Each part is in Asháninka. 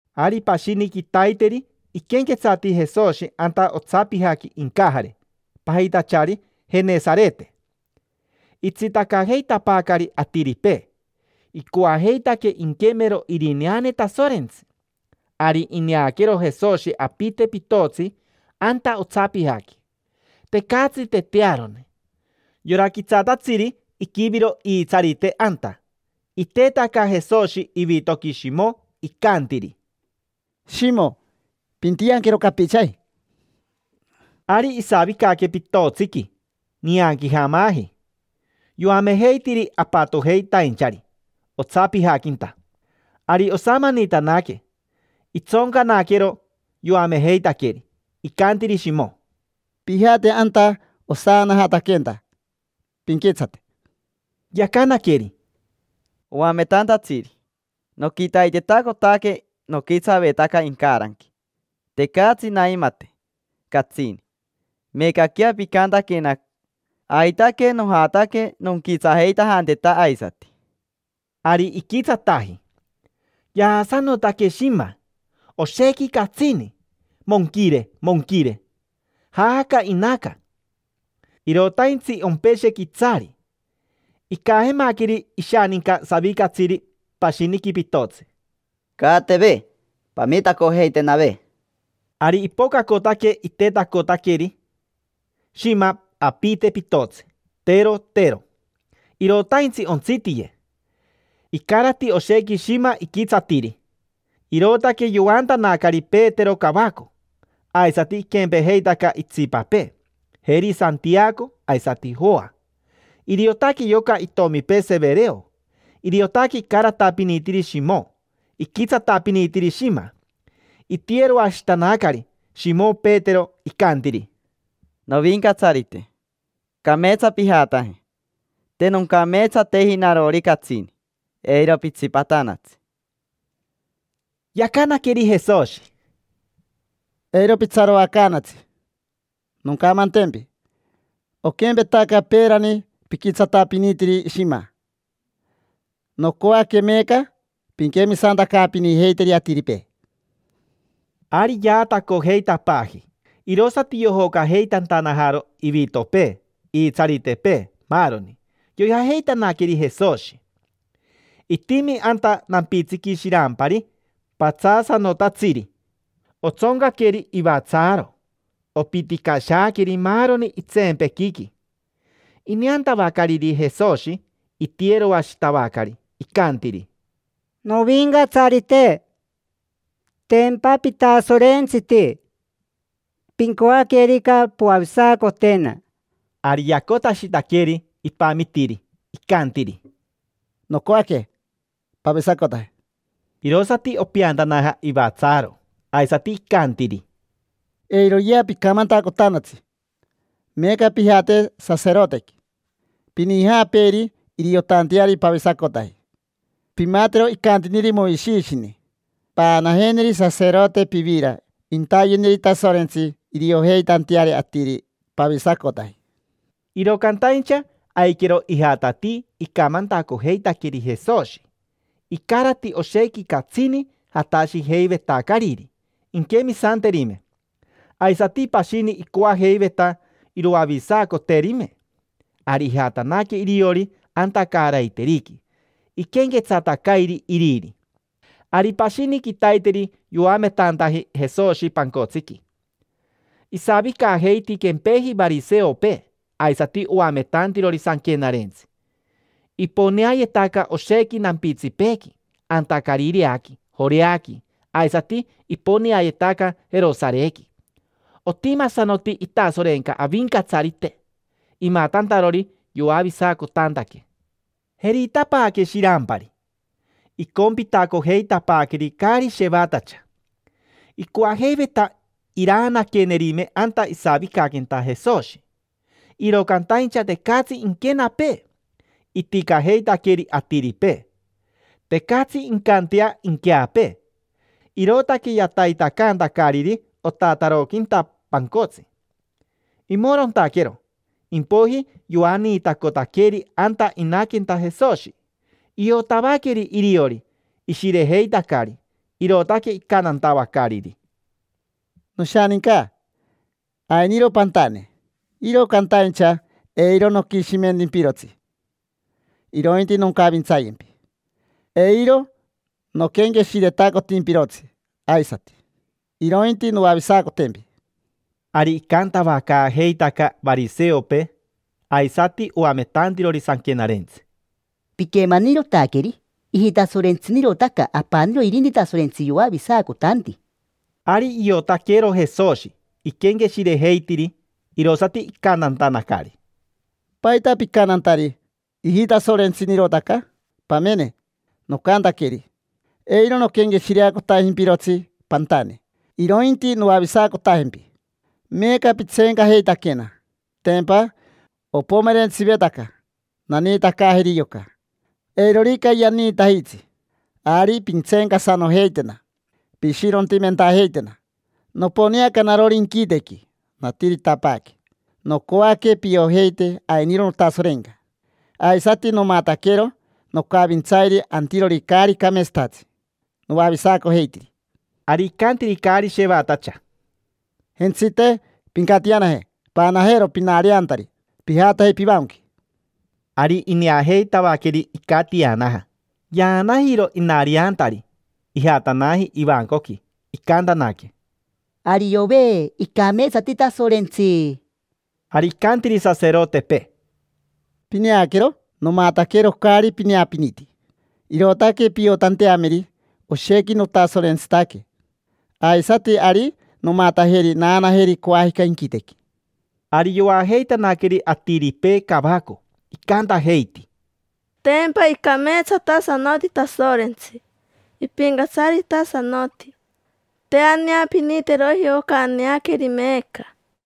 Ari pashini quitaiteri iquenquetsati Jesoshi anta otsapijaqui incajare pajitachari Jenesarete. Itsitacajeitapaacari atiripee, icoajeitaque inquemero irineane Tasorentsi. Ari ineaquero Jesoshi apite pitotsi anta otsapijaqui. Tecatsi tetearone: yora quitsatatsiri iquiviro iitsarite anta. Itetaca Jesoshi ivitoqui Shimo, icantiri: —Shimo, pintianquero capichaji. Ari isavicaque pitotsiqui nianquijamaji, yoamejeitiri apatojeitainchari otsapijaquinta. Ari osamanitanaque, itsoncanaquero yoamejeitaqueri. Icantiri Shimo: —Pijate anta osaanajataquenta, pinquitsate. Yacanaqueri: —Oametantatsiri, noquitaitetacotaque noquitsavetaca incaranqui, tecatsi naimate catsini. Meecaquea picantaquena, aitaque nojataque nonquitsajeitajanteta aisati. Ari iquitsataji: yaasanotaque shima, oshequi catsini: monquire, monquire. Jaaca inaca, irotaintsi ompeshe quitsari. Icajemaqueri ishaninca savicatsiri pashiniqui pitotsi: —Caateve, pamitacojeitenave. Ari ipocacotaque, itetacotaqueri shima apite pitotsi, tero, tero; irotaintsi ontsitiye. Icarati oshequi shima iquitsatiri, irootaque yoantanacari Petero cavaco; aisati iquempejeitaca itsipapee: jeri Santiaco aisati Joa. Iriotaque yoca itomipee Severeo. Iriotaque icaratapinitiri Shimo iquitsatapinitiri shima. Itiyeroashitanacari Shimo Petero, icantiri: —Novincatsarite, cameetsa pijataje. Te noncameetsateji narori catsini, eiro pitsipatanatsi. Yacanaqueri Jesoshi: —Eiro pitsaroacaanatsi. Noncamantempi: oquempetaca peerani piquitsatapinitiri shima, nocoaque meeca pinquemisantacaapinijeiteri atiripee. Ari yaatacojeitapaaji, irosati yojocajeitantanajaro ivitopee, iitsaritepee, maaroni. Yoijajeitanaqueri Jesoshi. Itimi anta nampitsiqui shirampari patsaasanotatsiri: otsoncaqueri ivatsaaro, opiticashaaqueri maaroni itseempequiqui. Ineantavacariri Jesoshi, itiyeroashitavacari, icantiri: —Novincatsarite, tempa pitasorentsiti: pincoaquerica, poavisacotena. Ari yacotashitaqueri, ipamitiri. Icantiri: —Nocoaque. Pavisacotaje. Irosati opeantanaja ivatsaaro. Aisati icantiri: —Eiroyea picamantacotanatsi. Meeca pijate saserotequi, pinijaapeeri iriotanteari pavisacotaji. Pimatero icantiniri Moishishini: paanajeneri saserote pivira intayeneri Tasorentsi iriojeitanteari atiri pavisacotaji. Iro cantaincha aiquero ijatatii icamantacojeitaqueri Jesoshi. Icarati oshequi catsini jatashijeivetacariri inquemisanterime, aisati pashini icoajeiveta iroavisacoterime. Ari ijatanaque iriori anta caaraiteriqui, iquenquetsatacairi iriri. Ari pashini quitaiteri yoametantaji Jesoshi pancotsiqui. Isavicajeiti quempeji variseopee aisati oametantirori sanquenarentsi: iponeayetaca oshequi nampitsipeequi, anta Carireaqui, Joreaqui, aisati iponeayetaca Jerosarequi. Otimasanoti itasorenca Avincatsarite imatantarori yoavisacotantaque. Jeritapaaque shirampari, icompitacojeitapaaqueri caari shevatacha. Icoajeiveta iraanaquerime anta isavicaquenta Jesoshi, iro cantaincha tecatsi inquenapee, iticajeitaqueri atiripee. Tecatsi incantea inqueapee, irootaque yataitacantacariri otataroquinta pancotsi. Imorontaquero, impoiji yoaniitacotaqueri anta inaquenta Jesoshi. Iotavaqueri iriori ishirejeitacari, irootaque icantantavacariri: —Noshaninca, ainiro pantane, iro cantaincha eiro noquishimentimpirotsi, irointi noncavintsayempi: eiro noquenqueshiretacotimpirotsi aisati, irointi noavisacotempi. Ari icantavacaajeitaca variseopee aisati oametantirori sanquenarentsi: —Piquemanirotaqueri: ijitasorentsinirotaca. Apaniro irinti Tasorentsi yoavisacotanti. Ari iotaquero Jesoshi iquenqueshirejeitiri, irosati icantantanacari: —¿Paita picantantari: “Ijitasorentsinirotaca”? Pamene, nocantaqueri: “Eiro noquenqueshireacotajimpirotsi pantane, irointi noavisacotajempi”. Meeca pitseencajeitaquena. Tempa opomerentsivetaca naniitacaajeri yoca. Eirorica yaniitajitsi, ari pintseencasanojeitena, pishirontimentajeitena. Noponeaca narori inquitequi, natiritapaaque. Nocoaque piojeite ainiro notasorenca, aisati nomataquero nocavintsairi antirori caari cameetsatatsi, noavisacojeitiri. Ari icantiri caari shevatacha: —Jentsite, pincatianaje, paanajero pinariantari, pijataje pivancoqui. Ari ineajeitavaqueri icatianaja, yaanajiro inariantari, ijatanaji ivancoqui. Icantanaque: —Ariove, icameetsati Tasorentsi. Ari icantiri saserotepee: —Pineaquero, nomataquero caari pineapiniti, irootaque piotanteameri oshequi notasorentsitaque. Aisati ari nomatajeri naanajeri coajica inquitequi. Ari yoajeitanaqueri atiripee cavaco, icantajeiti: —Tempa icameetsatasanoti Tasorentsi, ipincatsaritasanoti. Te aneapiniteroji oca aneaqueri meeca.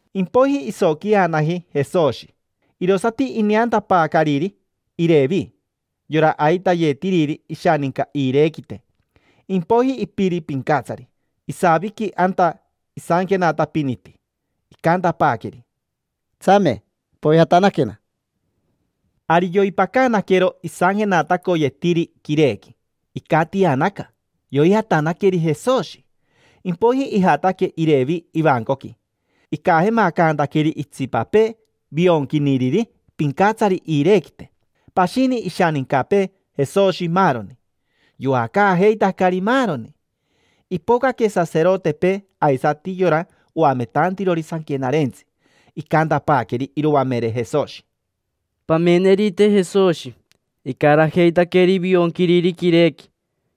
Impoiji isoquijanaji Jesoshi, irosati ineantapaacariri Irevi, yora aitayetiriri ishaninca iirequite, impoiji ipiri pincatsari. Isaviqui anta isanquenatapiniti. Icantapaaqueri: —Tsame, poijatanaquena. Ari yoipacanaquero isanquenatacoyetiri quirequi, icatianaca, yoijatanaqueri Jesoshi. Impoiji ijataque Irevi ivancoqui, icajemacantaqueri itsipapee vionquiniriri pincatsari iirequite, pashini ishanincapee, Jesoshi, maaroni. Yoacaajeitacari maaroni. Ipocaque saserotepee aisati yora oametantirori sanquenarentsi. Icantapaaqueri iroamere Jesoshi: —Pamenerite Jesoshi: icarajeitaqueri vionquiriri quirequi,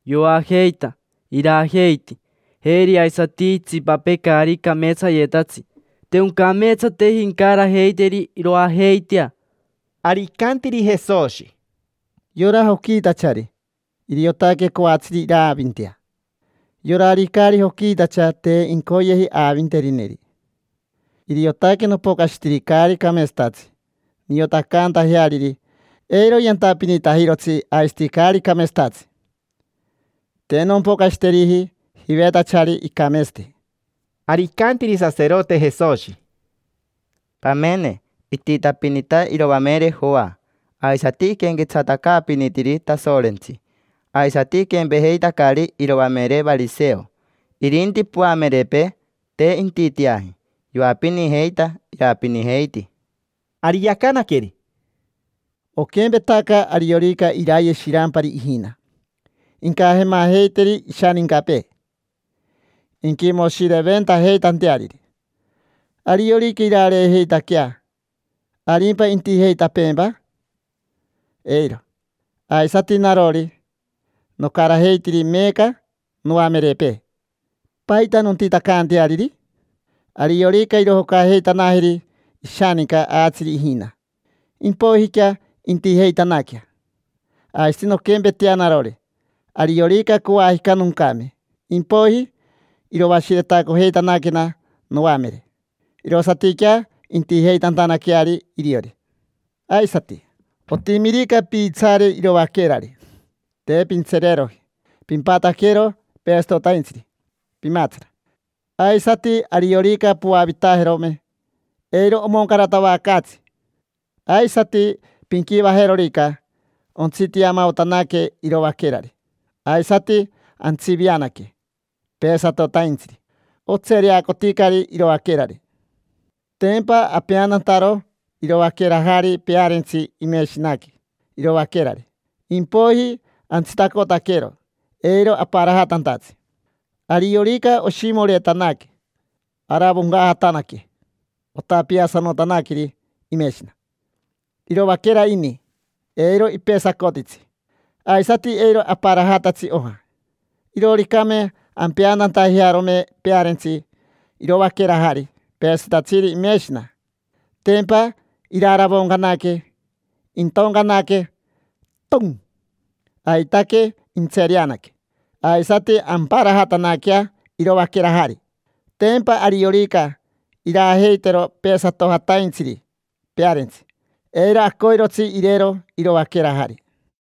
yoajeita, irajeiti. Jeri aisati itsipapee caari cameetsayetatsi. Te oncameetsateji incarajeiteri iroajeitea. Ari icantiri Jesoshi: —Yora joquiitachari iriotaque coatsiri iraavintea. Yorari caari joquiitacha te incoyeji aavinterineri. Iriotaque nopocashitiri caari cameetsatatsi niotacantajeariri eiro yantapinitajirotsi aisati caari cameetsatatsi. Te nompocashiteriji jivetachari icameetsati. Ari icantiri saserote Jesoshi: —Pamene ititapinita iroamere Joa, aisati iquenquetsatacaapinitiri Tasorentsi: aisati iquempejeitacari iroamere variseo. Irinti poamerepee, te intiteaji: yoapinijeita, irapinijeiti. Ari yacanaqueri: —Oquempetaca ariorica iraye shirampari ijina, incajemajeiteri ishanincapee inquimoshireventajeitanteariri. Ariorica irareejeitaquea, ¿arimpa intijeitapeempa? Eiro. Aisati narori, nocarajeitiri meeca noamerepee: ¿paita nontitacanteariri? Ariorica irojocajeitanajeri ishaninca aatsiri ijina, impoijiquea intijeitanaquea. Aisati nonquempetea narori: ariorica coajica noncame, impoiji iroashiretacojeitanaquena noamere, irosatiquea intijeitantanaqueari iriori. Aisati, otimirica piitsaare iroaquerari, te pintsereeroji pimpataquero peesatotaintsiri pimaatsara. Aisati, ariorica poavitajerome, eiro omoncaratavacaatsi. Aisati pinquivajerorica ontsitiamaotanaque iroaquerari, aisati antsivianaque peesatotaintsiri. Otsereacoticari iroaquerari. Tempa apeantantaro iroaquerajari pearentsi imeshinaqui iroaquerari, impoiji antsitacotaquero eiro aparajatantatsi. Ariorica oshimoretanaque, aravoncajatanaque, otapiasanotaqueri imeshina. Iroaquera ini, eiro ipesacotitsi, aisati eiro aparajatatsi oja. Irooricame ampeantantajearome pearentsi iroaquerajari peesatitatsiri imeshina, tempa iraravoncanaque, intoncanaque: ton. Aitaque intsereanaque, aisati amparajatanaquea iroaquerajari. Tempa ariorica irajeitero peesatojataintsiri pearentsi, eiro acoirotsi irero iroaquerajari.